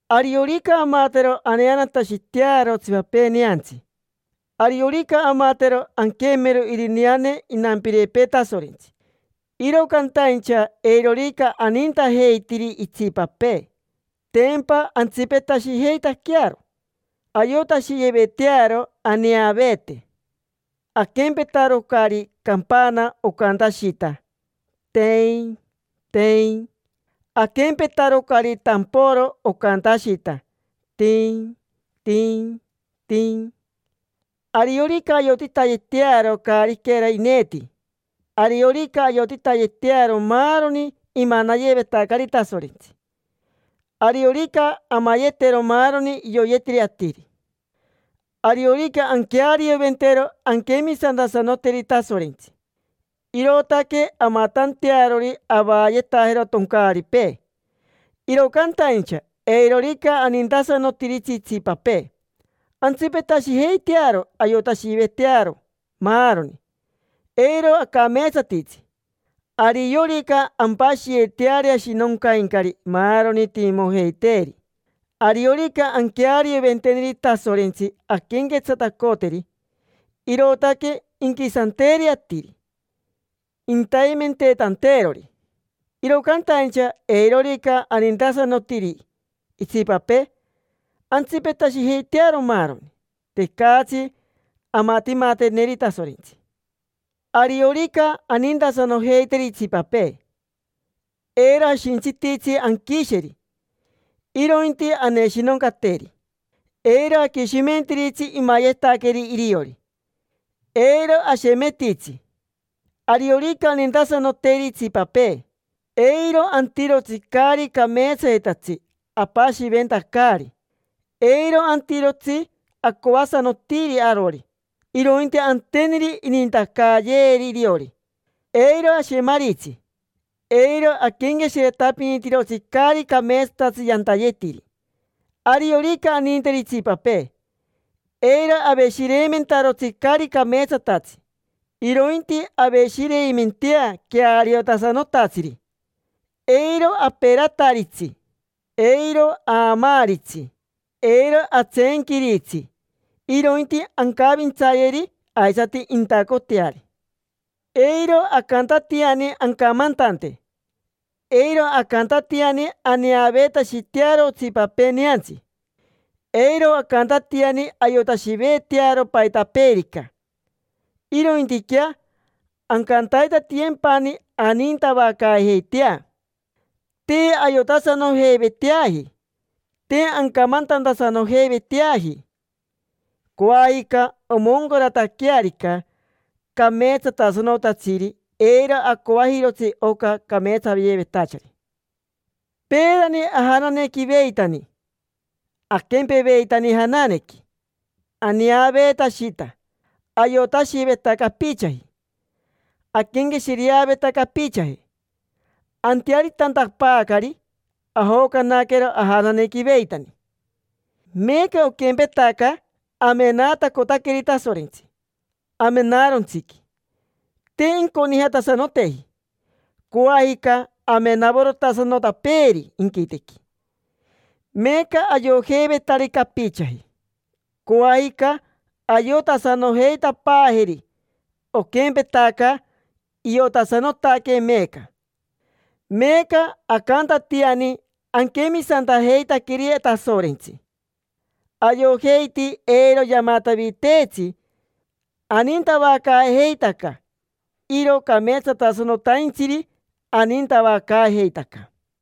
Ariorica amatero aneanatashitearo otsipapee neantsi, ariorica amatero anquemero irineane inampirepee Tasorentsi, iro cantaincha eirorica anintajeitiri itsipapee, tempa antsipetashijeitaquearo, ayotashiyevetearo aneaveete. Aquempetarocari campana, ocantashita, teeiin, teeiin. Aquempetarocari tamporo ocantashita, tin, tin, tin. Ariorica ayotitayetearo caariquera ineeti, ariorica ayotitayetearo maaroni imanayevetacari Tasorentsi, ariorica amayetero maaroni ioyetiri atiri, ariorica anquearioventero anquemisantasanoteri Tasorentsi, irootaque amatantearori avaayetajero toncaaripee: iro cantaincha eirorica anintasanotiri itsipapee, antsipetashijeitearo ayotashivetearo maaroni, eiro acameetsatitsi. Ariorica ampashiyeteari ashinoncaincari maaroni timimojeiteeri, ariorica anquearioventeneri Tasorentsi anquenquetsatacoteri, irootaque inquisanteeri atiri, intaimenteetanteerori; iro cantaincha eirorica anintasanotiri itsipapee, antsipetashijeitearo maaroni, tecatsi amatimateneri Tasorentsi. Ariorica anintasanojeiteri itsipapee, eiro ashintsititsi anquisheri, irointi aneshinoncateri, eiro aquishimentiritsi imayetaqueri iriori, eiro ashemetitsi. Ariorica anintasanoteri itsipapee, eiro antirotsi caari cameetsayetatsi apashiventacari, eiro antirotsi acoasanotiri arori, irointi anteneri inintacayeeri iriori; eiro ashemaritsi, eiro aquenqueshiretapinitirotsi caari cameetsatatsi yantayetiri. Ariorica aninteri itsipapee, eiro aveshireimentarotsi caari cameetsatatsi, irointi aveshireimentea queariotasanotatsiri, eiro aperataritsi, eiro aamaaritsi, eiro atseenquiritsi, irointi ancavintsayeri aisati intacoteari. Eiro acantatiani ancamantante, eiro acantatiani aneaveetashitearo otsipapee neantsi. Eiro acantatiani ayotashivetearo paitapeerica, irointiquea ancantaitatiyempani anintavacaajeitea. Te ayotasanojeiveteaji, te ancamantantasanojeiveteaji. Coajica omoncarataquearica cameetsatasanotatsiri, eiro acoajirotsi oca cameetsayevetachari. Peerani ajananequiveitani, aquempeveitani jananequi aneaveetashita, ayotashiveta capichaji, aquenqueshireaveta capichaji. Antearitantapaacari, ajocanaquero ajananequiveitani. Meeca oquempetaca amenaatacotaqueri Tasorentsi amenaarontsiqui, te inconijatasanoteji. Coajica amenavorotasanotapeeri inquitequi. Meeca ayojeivetari capichaji, coajica ayotasanojeitapaajeri, oquempetaca iotasanotaquee meeca. Meeca acantatiani aquemisantajeitaqueri Tasorentsi, ayojeiti eiro yamataviteetsi, anintavacaajeitaca. Iro cameetsatasanotaintsiri anintavacaajeitaca.